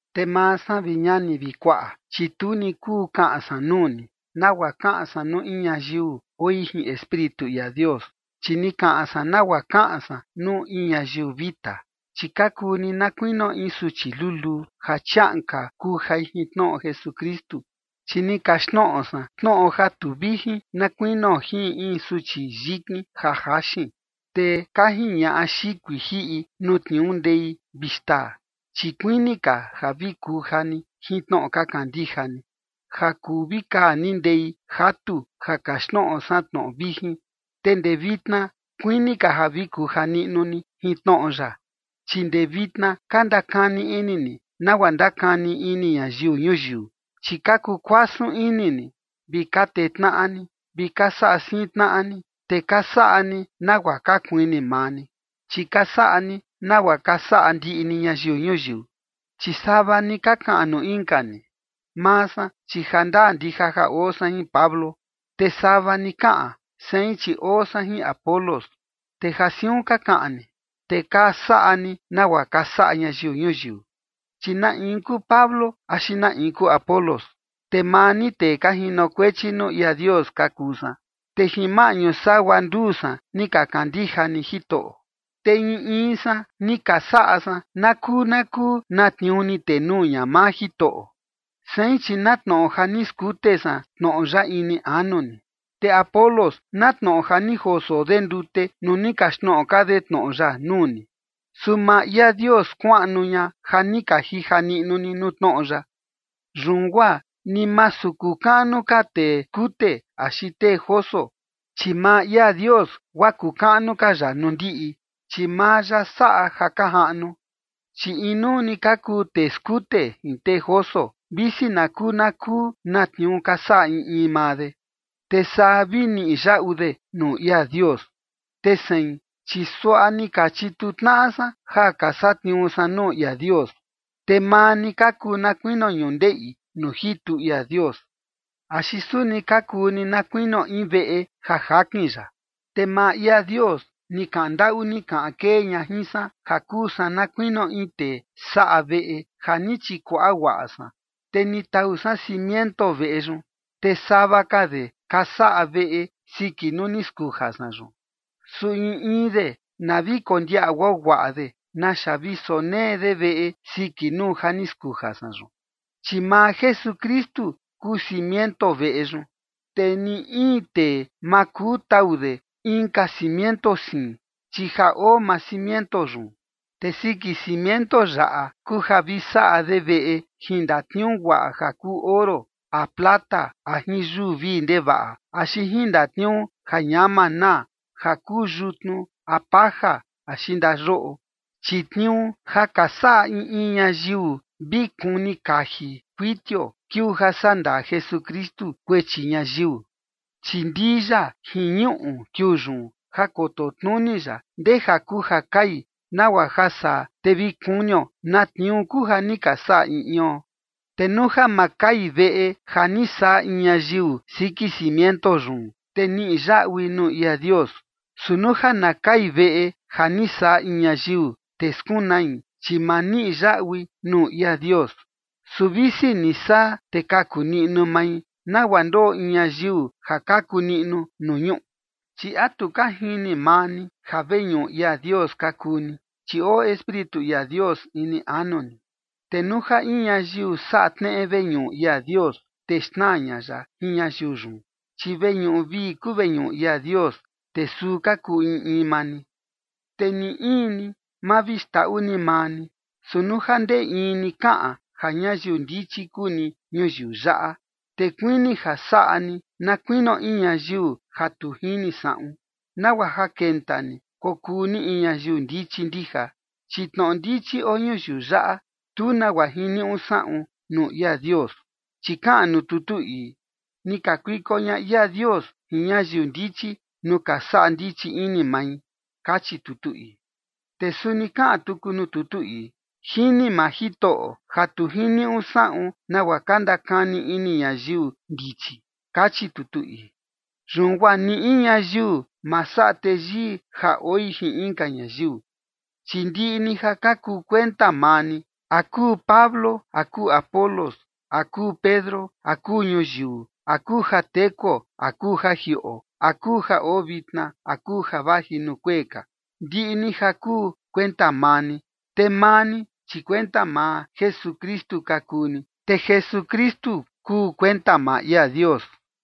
Te maa san, vi ñani vi kuaꞌa, chi tu ni kuu kaꞌan san nuu ni, nagua kaꞌan san nuu in ñayiu oi jin Espíritu ia Dios, chi ni kaꞌan san nagua kaꞌan san nuu in ñayiu vita, chi ka kuu ni na kuinio in suchi luluu ja chiaꞌan ka kujai jin tnoꞌo Jesukristu. Chi ni kaxtnoꞌo san tnoꞌo ja tu vijin na kuinio jin in suchi yikin ja jaxin, te ka jiñaꞌa xikui jiꞌi nuu tniuu ndei vi xtaa. Chi kuini ka ja vi kuja ni jin tnoꞌo ka kandija ni, ja kuu vi kaa ni ndei jatu ja kaxtnoꞌo san tnoꞌo vijin, te ndee vitna kuini ka ja vi kuja niꞌnu ni jin tnoꞌo ya. Chi ndee vitna ka ndakani ini ni nagua ndakani ini ñayiu ñuyiu, chi ka kuu kuasun ini ni, vi ka tee tnaꞌa ni, vi ka saꞌa siin tnaꞌa ni, te ka saꞌa ni nagua ka kuini maa ni, chi ka saꞌa ni nagua ka saꞌa ndiꞌi ni ñayiu ñuyiu. Chi sava ni ka kaꞌan nuu inka ni: “Maa san, chi jandaa ndija ja oo san jin Pablo”, te sava ni kaꞌan: “Sein, chi oo san jin Apolos”. Te ja siun ka kaꞌan ni, te ka saꞌa ni nagua ka saꞌa ñayiu ñuyiu. Chi ¿na in kuu Pablo axi na in kuu Apolos? Te maa ni tee ka jinokuechi nuu ia Dios ka kuu san, te jin maꞌñu sagua nduu san ni ka kandija ni Jitoꞌo. Te in in san ni ka saꞌa san na kuu na kuu na tniuu ni tenuu ña maa Jitoꞌo. Sein, chi na tnoꞌo ja ni skute san tnoꞌo ya ini anu ni, te Apolos na tnoꞌo ja ni joso de ndute nuu ni kaxtnoꞌo ka de tnoꞌo ya nuu ni. Su maa ia Dios skuaꞌnu ña ja ni ka jija niꞌnu ni nuu tnoꞌo ya. Yun guaa ni masu kuu kaꞌnu ka tee skute axi tee joso, chi maa ia Dios guaa kuu kaꞌnu ka ya nuu ndiꞌi, chi maa ya saꞌa ja ka jaꞌnu. Chi inuu ni ka kuu tee skute jin tee joso, visi na kuu na kuu na tniuu ka saꞌa in in maa de, te saa vi niꞌi yaꞌu de nuu ia Dios. Te sein, chi suaꞌa ni ka chituu tnaꞌa san ja ka satniuu san nuu ia Dios, te maa ni ka kuu na kuinio ñundeꞌi nuu jitu ia Dios. Axi suni ka kuu ni na kuinio in veꞌe ja jakin ya. Te maa ia Dios ni kaꞌan ndaꞌu ni kaꞌan kee ña jin san ja kuu san na kuinio in tee saꞌa veꞌe ja ni chikuaꞌa guaꞌa san, te ni tau san cimiento veꞌe yun. Te sava ka de ka saꞌa veꞌe siki nuu ni skuja san yun. Su in in de, na vi kondiaꞌa guaguaꞌa de naxa vi sonee de veꞌe siki nuu ja ni skuja san yun. Chi maa Jesukristu kuu cimiento veꞌe yun, te ni in tee ma kuu tau de inka cimiento siin, chi ja oo maa cimiento yun. Te siki cimiento yaꞌa kuu ja vi saꞌa de veꞌe jin ndatniuu guaꞌa ja kuu oro a plata a jin yuu vii ndevaꞌa, axi jin ndatniuu ja ñama naa, ja kuu yutnu a paja axi ndayoꞌo. Chi tniuu ja ka saꞌa in in ñayiu vi kuni kaji kuitio kiuu ja sandaa Jesukristu kuechi ñayiu. Chi ndii ya jin ñuꞌu kiuu yun, ja koto tnuni ya ndeja kuu ja kai, nagua ja saa te vi kunio na tniuu kuu ja ni ka saꞌa in ion. Te nuu ja ma kai veꞌe ja ni saꞌa in ñayiu siki cimiento yun, te niꞌi yaꞌui nuu ia Dios. Su nuu ja na kai veꞌe ja ni saꞌa in ñayiu, te skunai, chi ma niꞌi yaꞌui nuu ia Dios. Su visi ni saa, te kaku niꞌnu mai, nagua ndoꞌo in ñayiu ja kaku niꞌnu nuu ñuꞌu. Chi ¿a tu ka jini maa ni ja veñuꞌu ia Dios ka kuu ni, chi oo Espíritu ia Dios ini anu ni? Te nuu ja in ñayiu saꞌa tneꞌe veñuꞌu ia Dios, te xnaa ña ya jin ñayiu yun, chi veñuꞌu vii kuu veñuꞌu ia Dios, te suu ka kuu in in maa ni. Te ni in ni, ma vi xndaꞌu ni maa ni, su nuu ja ndee in ni kaꞌan ja ñayiu ndichi kuu ni ñuyiu yaꞌa, te kuini ja saꞌa ni na kuinio in ñayiu ja tu jini saꞌun, nagua ja kenta ni kokuu ni in ñayiu ndichi ndija. Chi tnoꞌo ndichi oo ñuyiu yaꞌa, tu nagua jiniuꞌu saꞌun nuu ia Dios. Chi kaꞌan nuu tutu ii: “Ni kakuiko ña ia Dios jin ñayiu ndichi nuu ka saꞌa ndichi ini mai”, kachi tutu ii. Te suni kaꞌan tuku nuu tutu ii: “Jini maa Jitoꞌo ja tu jiniuꞌu saꞌun nagua ka ndakani ini ñayiu ndichi”, kachi tutu ii. Yun guaa ni in ñayiu ma saꞌa teyii ja oi jin inka ñayiu, chi ndiꞌi ni ja ka kuu kuenta maa ni, a kuu Pablo a kuu Apolos a kuu Pedro a kuu ñuyiu a kuu ja tekuo a kuu ja jiꞌo a kuu ja oo vitna a kuu ja vaji nuu kuee ka. Ndiꞌi ni ja kuu kuenta maa ni. Te maa ni, chi kuenta maa Jesukristu ka kuu ni, te Jesukristu kuu kuenta maa ia Dios.